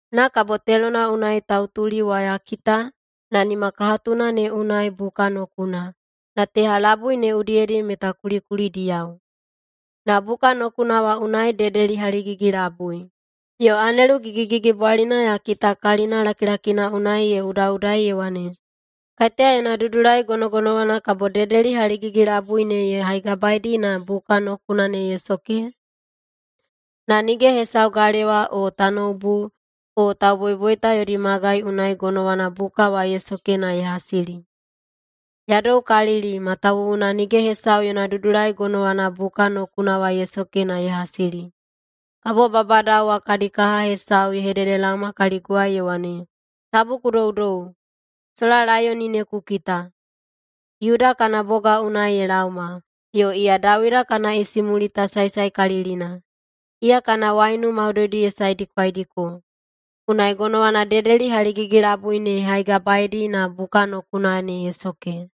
Na kabo telona unai tautuli wa ya kita na nimakahatuna ne unai buka nokuna, na teha labui ne udiyedi meta kulikulidiyao. Na buka nokuna wa unai dedeli haligigi-labui. Yo anelu gigigigibwalina ya kita kalina lakilakina unai ye udaꞌudai ye wane, “Kaiteya yona dudulai gonogonowana kabo dedeli haligigi-labui ne ye haigabaedi na buka nokuna ne ye soke?” Na nige hesau galewa o tanoubu o tauboiboita yodi magai unai gonowana buka wa ye soke na ye hasili. Ya doukalili, matawuwuna nige hesau yona dudulai gonowana buka nokuna wa ye soke na ye hasili. Kabo babadao wa kadi kaha hesau ye hededelaoma kaliguwai ye wane, “Tabu ku doudou! Sola Laiyoni ne ku kita! Yuda kana boga unai ye laoma, yo iya Dawida kana isimulita saesaekalilina. Iya kana waiunu maudoidi ye saedikwaidiko, unai gonowana dedeli haligigi-labui ne ye haigabaedi na buka nokuna ne ye soke.”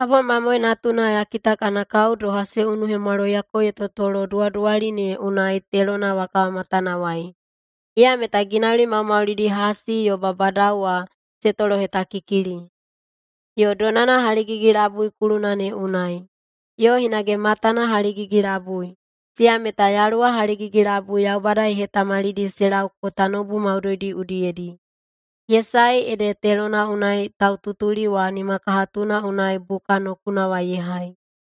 Kabo Mamoe Natuna ya kita kana kao doha se unuhemwaloiyako ye totolo duwaduwali ne unai telona wa kawamatanawai. Iya meta ginauli maumaulidi hasi yo babadao wa se tolohetakikili. Yo donana haligigi-labui kuluna ne unai. Yo hinage matana haligigi-labui, siya meta yaluwa haligigi-labui Yaubada ye hetamalidi se lauko tanoubu maudoidi udiyedi. Ye sae ede telona unai taututuli wa nimakahatuna unai buka nokuna wa ye hai.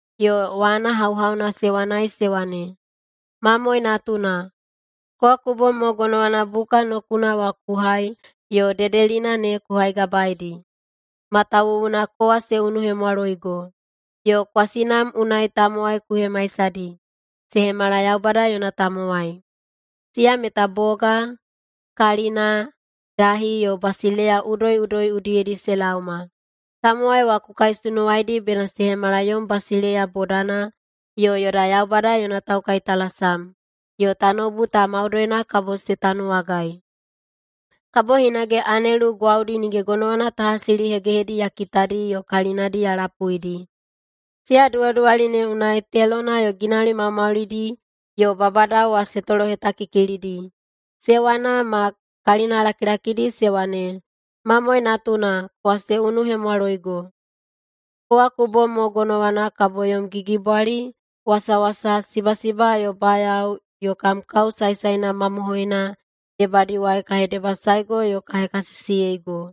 Yo wana hauhauna se wanai se wane, “Mamoe Natuna! Kowa ku bom mo gonowana buka nokuna wa ku hai yo dedelina ne ku haigabaedi. Matawuwuna kowa se unuhemwaloigo, yo kwasinam unai tamowai ku hemaisahaidi se hemala Yaubada yona tamowai. Siya meta boga, kalina, dahi, yo basileiya udoiꞌudoi udiyedi se laoma. Tamowai wa ku kaisunuwaidi bena se hemala yom basileiya bodana yo yoda Yaubada yona taukaitalasam, yo tanoubu ta maudoina kabo se tanuwagai.” Kabo hinage anelu gwaudi nige gonowana ta hasilihegehedi ya kitadi yo kalinadi ya lapuidi. Siya duwaduwali ne unai telona yo ginauli maumaulidi yo babadao wa se tolohetakikilidi. Se wana ma kalinalakilakidi se wane, “Mamoe Natuna! Kowa se unuhemwaloigo. Kowa ku bom mo gonowana kabo yom gigibwali, wasawasa, sibasiba, yo bayao yo kam kao saesaena mamohoina debadiwai ka hedebasaego yo ka hekasisiyeigo.”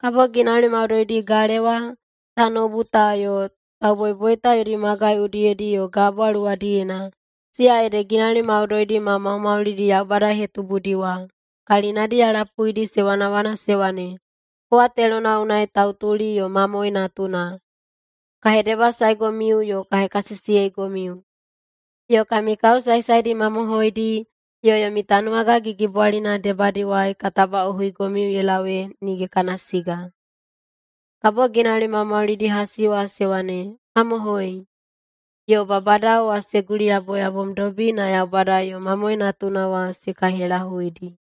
Kabo ginauli maudoidi galewa, tanoubu ta yo tauboiboita yodi magai udiyedi yo gabwa luwadiyena, siya ede ginauli maudoidi maumaulidi Yaubada ye hetubudi wa, kalinadi ya lapuidi se wanawana se wane, “Kowa telona unai tautuli yo Mamoe Natuna, ka hedebasaegomiu yo ka hekasisiyeigomiu, yo kami kao saesaedi mamohoidi yo yomi tanuwaga gigibwalina debadiwai ka tabaꞌohuigomiu ye lau ee nige kana siga.” Kabo ginauli maumaulidi hasi wa se wane, “Mamohoi”, yo babadao wa se guliyaboyabomdobi na Yaubada yo Mamoe Natuna wa se kaihelahuidi.